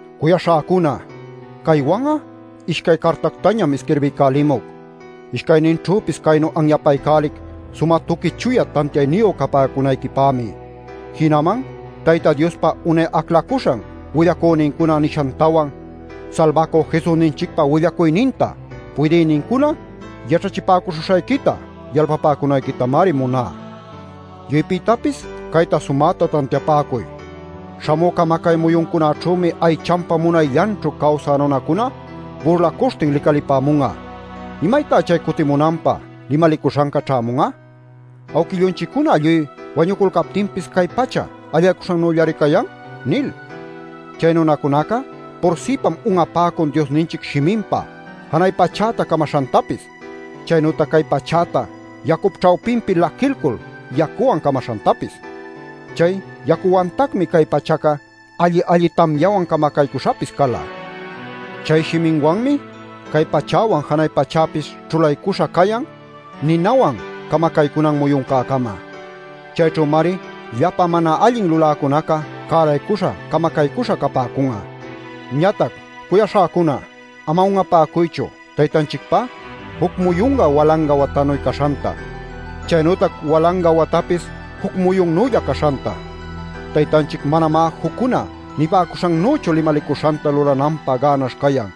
Cuyaśhäcuna, caywan'a ishcay cartactañam isquirbiycälimuc. Ishcayninćhüpis caynu anyapaycälic sumä tuqui chuya tantiayniyu capäcunayquipämi. Jinaman Tayta Diospa unay aclacüśhan willacünincuna nishantawan Salbacü Jesusninchicpa willacuyninta puydïnincuna yaćhachipäcuśhuśhayquita yalpapäcunayquitamari muná. Lluypïtapis cayta sumäta tantiapäcuy: śhamü camacay muyuncunäćhümi aychanpa munayllanćhu cawsä nunacuna burlacuśhtin licalipämun'a “¿Imaytá chay cutimunanpä limalicuśhanca ćhämun'a? Awquillunchiccuna lluy wañuculcaptinpis cay pachaca allaycuśhannüllari cayan” nil. Chay nunacunaca pursïpam un'apäcun Diosninchic shiminpa janay pachäta camaśhantapis, chaynütac cay pachäta yacup ćhawpinpi laquilcul yacuwan camaśhantapis. Chay yacüwantacmi cay pachaca alli-alli tamyawan camacaycuśhapis cala. Chay shiminwanmi cay pachäwan janay pachäpis ćhulaycuśha cayan ninawan camacaycunan muyuncäcama. Chayćhümari llapa mana allin luläcunaca cäraycuśha camacaycuśha capäcun'a. Ñatac, cuyaśhäcuna, ama un'apäcuychu Taytanchicpá juc muyunca walanga watanuy caśhanta, chaynütac walanga watapis juc muyunnülla caśhanta. Taytanchic manamá juccuna nipäcuśhannüchu limalicuśhanta lulananpä gänaśh cayan.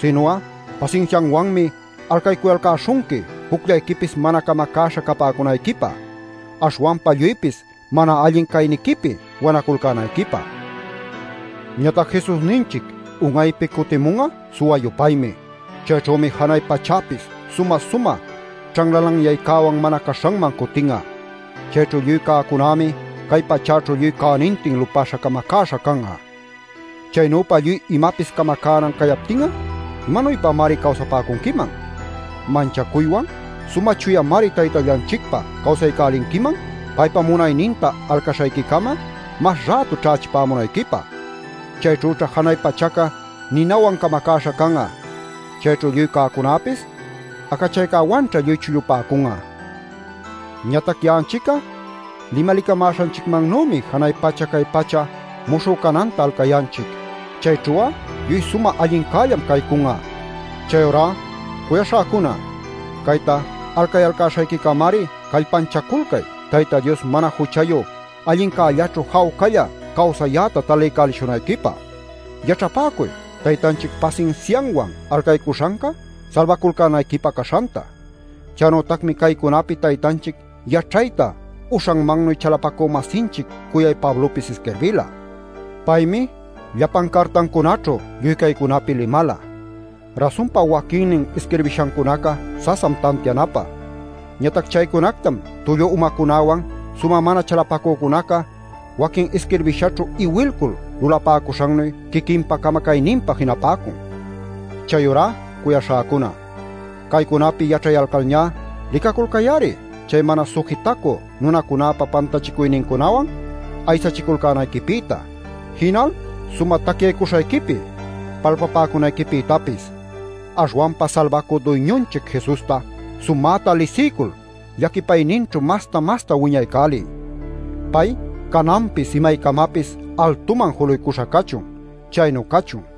Sinu'a pasinsiawanmi alcaycuyalcäśhunqui jucllayquipis mana camacäśha capäcunayquipä, aśhwanpa lluypis mana allin cayniquipi wanaculcänayquipä. Ñatac Jesusninchic un'aypi cutimun'a suwa-yupaymi. Chayćhümi janay pachäpis sumä-sumä ćhanlalanyaycäwan mana caśhanman cutin'a. Chayćhu lluy cäcunämi cay pachäćhu lluy cänintin lupäśha camacäśha can'a. Chaynüpa lluy imapis camacänan cayaptin'a ¿imanuypamari cawsapäcunquiman? Manchacuywan sumä chuyamari Taytallanchicpä cawsaycälinquiman paypa muyunninta alcaśhayquicama mas rätu ćhächipämunayquipä. Chayćhüćha janay pachaca ninawan camacäśha can'a; chayćhu lluy cäcunäpis acachaycäwanćha lluy chullupäcun'a. Ñatac ya'anchic'a limalicamäśhanchicmannümi janay pacha cay pacha muśhü cananta alcayanchic. Chayćhu'a lluy sumä allincällam caycun'a. Chayurá, cuyaśhäcuna, cayta alcayalcäśhayquicamari callpanchaculcay Tayta Dios mana juchayu allincällaćhu jawcalla cawsayäta taliycälishunayquipä. Yaćhapäcuy Taytanchic pasinsianwan alcaycuśhanca salbaculcänayquipä caśhanta. Chaynütacmi caycunapi Taytanchic yaćhayta uśhanmannuy chalapacü-masinchic cuyay Pablopis isquirbila. Paymi llapan cartancunaćhu lluy caycunapi limala. Rasunpa waquinnin isquirbishancunaca sasam tantianapä. Ñatac chaycunactam tullu umacunäwan sumä mana chalapacücunaca waquin isquirbishaćhu iwilcul lulapäcuśhannuy quiquinpa camacayninpä jinapäcun. Chayurá, cuyaśhäcuna, caycunapi yaćhayalcalñá licaculcay-ari chay mana sujitacü nunacunäpa pantachicuynincunawan aysachiculcänayquipïta, jinal sumä tacyaycuśhayquipi palpapäcunayquipïtapis. Aśhwanpa Salbacü Duyñunchic Jesusta sumäta lisiycul llaquipayninćhu masta-masta wiñaycäliy. ¡Pay cananpis imaycamapis altuman juluycuśha cachun! Chaynu cachun.